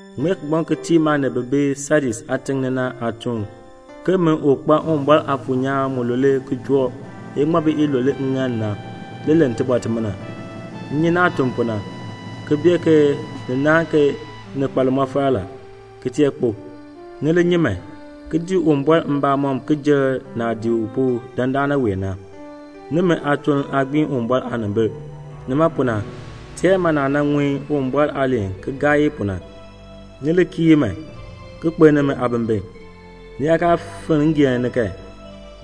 "Ŋmee kigbaŋ ki tii maanib bi bi Sadis aatiŋ ni na aatuun ke min u kpa Uwumbɔr Aafuur nyaan mulule ki joo iŋmabi ilule ŋŋaal ni na, le len tibɔr timina: M nyi naah tun pu na, ki bee ke ni naahn ke ni kpa limɔfal la, ki tee kpo. Ni li nyi man, ki dii Uwumbɔr mbamɔm ki jer naah dii u pu dandana wee na; nimi aatuln aa gbiin Uwumbɔr aanimbil. Nima pu na, teer man naah nan ŋun Uwumbɔr aaliin ki gaa i pu na. Ni li kii i man, ki kpeln nimi aabimbin. Ni yaa kaa finn ngeen ni kan,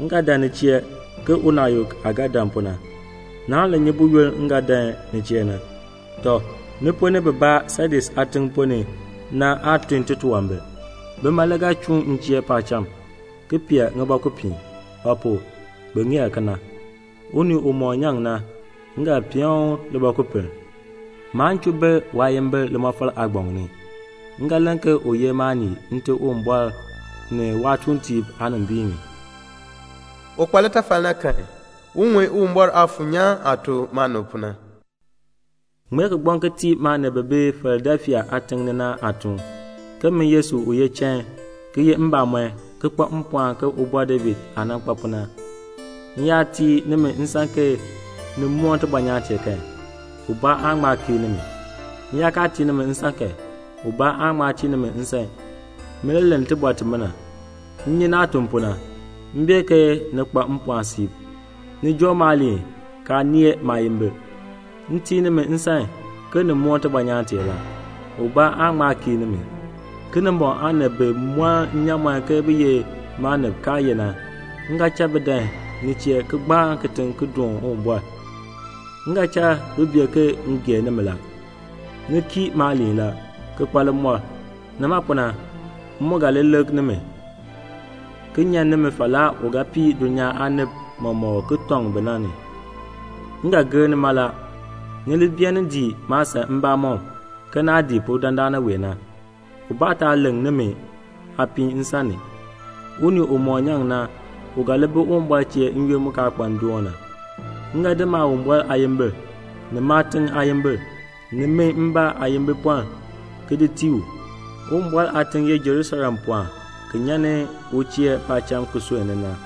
m ga dan ni chee ke unaayuk aah ga dan pu na. Naan li nyi buyoonn m ga dan ni chee na. Tɔ, ni ponn ni bibaa Sadis aatiŋ ponn ni na aa tun titunwambir. Bima le ga chuun m chee paacham, ki pee ŋibɔkupiin; ba pu? bi ŋeer kena. Unii umɔk nyaŋ na, m ga peen u libɔkupiln. Maan chuu ber waayimbil limɔfal aagbaŋ ni. M ga len ke u ye maanii Nte Uwumbɔr ni waatuuntiib aanimbiin ni. "Un kpa litafal na kan, un ŋun Uwumbɔr Aafuur nyaan aah tuk maanib pu na. "Ŋmee kigbaŋ ki tii maanib bi bi Filadelfia aatiŋ ni na aatuun, ke min Yesu u ye chain, ki ye mbamɔn, ki kpa mpɔɔn ke Ubɔr David aah nan kpa pu na, m yaa tii nimi nsan ke ni moon tibɔnyaan tee kan, ubaa aan ŋma kiir nimi, m yaa kaa tii nimi nsan kan, ubaa aan ŋma tii nimi nsan, min le len tibɔr timina: M nyi naah tun pu na. M bee ke ni kpa mpɔɔn siib. Ni joo maaliin kaa nee maayimbil. M tii nimi nsan ke ni moon tibɔnyaan tee la. Ubaa aan ŋma kiir nimi. Kinimbɔŋ aanib bi mɔn nnyaamɔn ke bi ye maanib kaa ye na, m ga cha bi dan ni chee ki gbaan kitiŋ ki doon Uwumbɔr. M ga cha bi bee ke m gee nimi la. Ni kii maaliin la, ki kpa limɔr. Nima pu na, m mu ga li lik nimi, ki nyan nimi falaa u ga pii dulnyaa aanib mɔmɔk ki tɔŋ bi na ni. M ga gir ni mala. Ni li beenin dii maasan mbamɔm ke naah dii pu dandana wee na, ubaa taa leŋ nimi aapiin nsan ni. Unii umɔk nyaŋ na, u ga li bi Uwumbɔr chee n-yoonn mu kaa kpa ndoon na. M ga di Maawumbɔr aayimbil, ni waatiŋ aayimbil, ni min mbaa aayimbipɔln ki di tii u. Uwumbɔr aatiŋ ye Jerusalem pɔɔn ki nyan ni u chee paacham ki sunn ni na.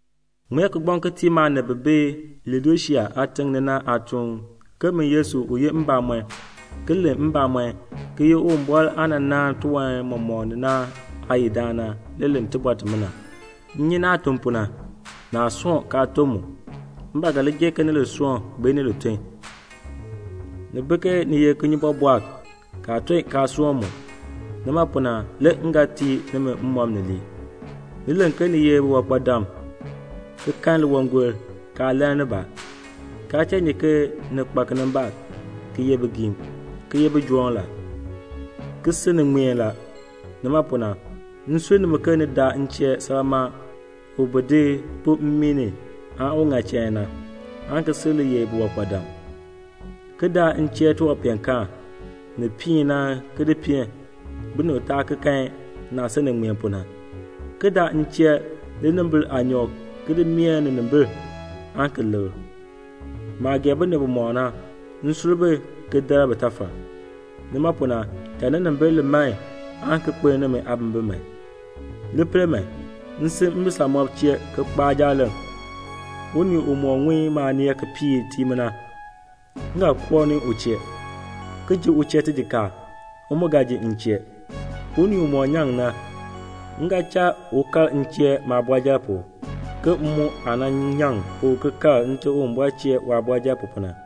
"Ŋmee kigbaŋ ki tii maanib bi bi Laodisea aatiŋ ni na aatuun ke min Yesu u ye mbamɔn, ki len mbamɔn, ki ye Uwumbɔr aah nan naan tiwan mɔmɔk na aayidaan na, le len tibɔr timina: M nyi naah tun pu na; naa soon kaa ton mu; m ba ga li gee ke ni li soon bee ni li ton. Ni bi ke ni ye kinyubɔbɔɔk, kaa ton kaa soon mu; nima pu na le m ga tii nimi mmɔb ni lii. Ni len ke ni ye biwankpadam ki kpeeni liwangol kaa lann nibaa, kaa tee nyi ke ni kpa kinimbaak, ki ye bigiim, ki ye bijoom la, ki si ni ŋmeen la. Nima pu na, m sur nimi ke ni daa m chee salmaa u bi di pu mmii ni un ŋa chain na, aan ki sil li ye biwankpadam; ki daa m chee tiwanpeenkaan ni piin na ki di peen, binib taa ki kan naah si ni ŋmeen pu na; ki daa m chee linimbil aanyɔk ki di mee ninimbil aan ki likr. Maah gee binib bimɔk na, m sur bi ki dar bitafal. Nima pu na, cha ninimbil li man aan ki kpeln nimi aabimbin man. Li pel man, m si mbisamɔb chee ki kpaa jaaleŋ. Unii umɔk ŋun maaneel ki piir tii mi na, m ga koo ni u chee, ki ji u chee tijikaar, u mu ga ji m chee. Unii umɔk nyaŋ na, m ga cha u kal m chee maabɔrjal pu, ke m mu aah nan nyaŋ pu ki kal Nte Uwumbɔr chee waabɔrjal pu na.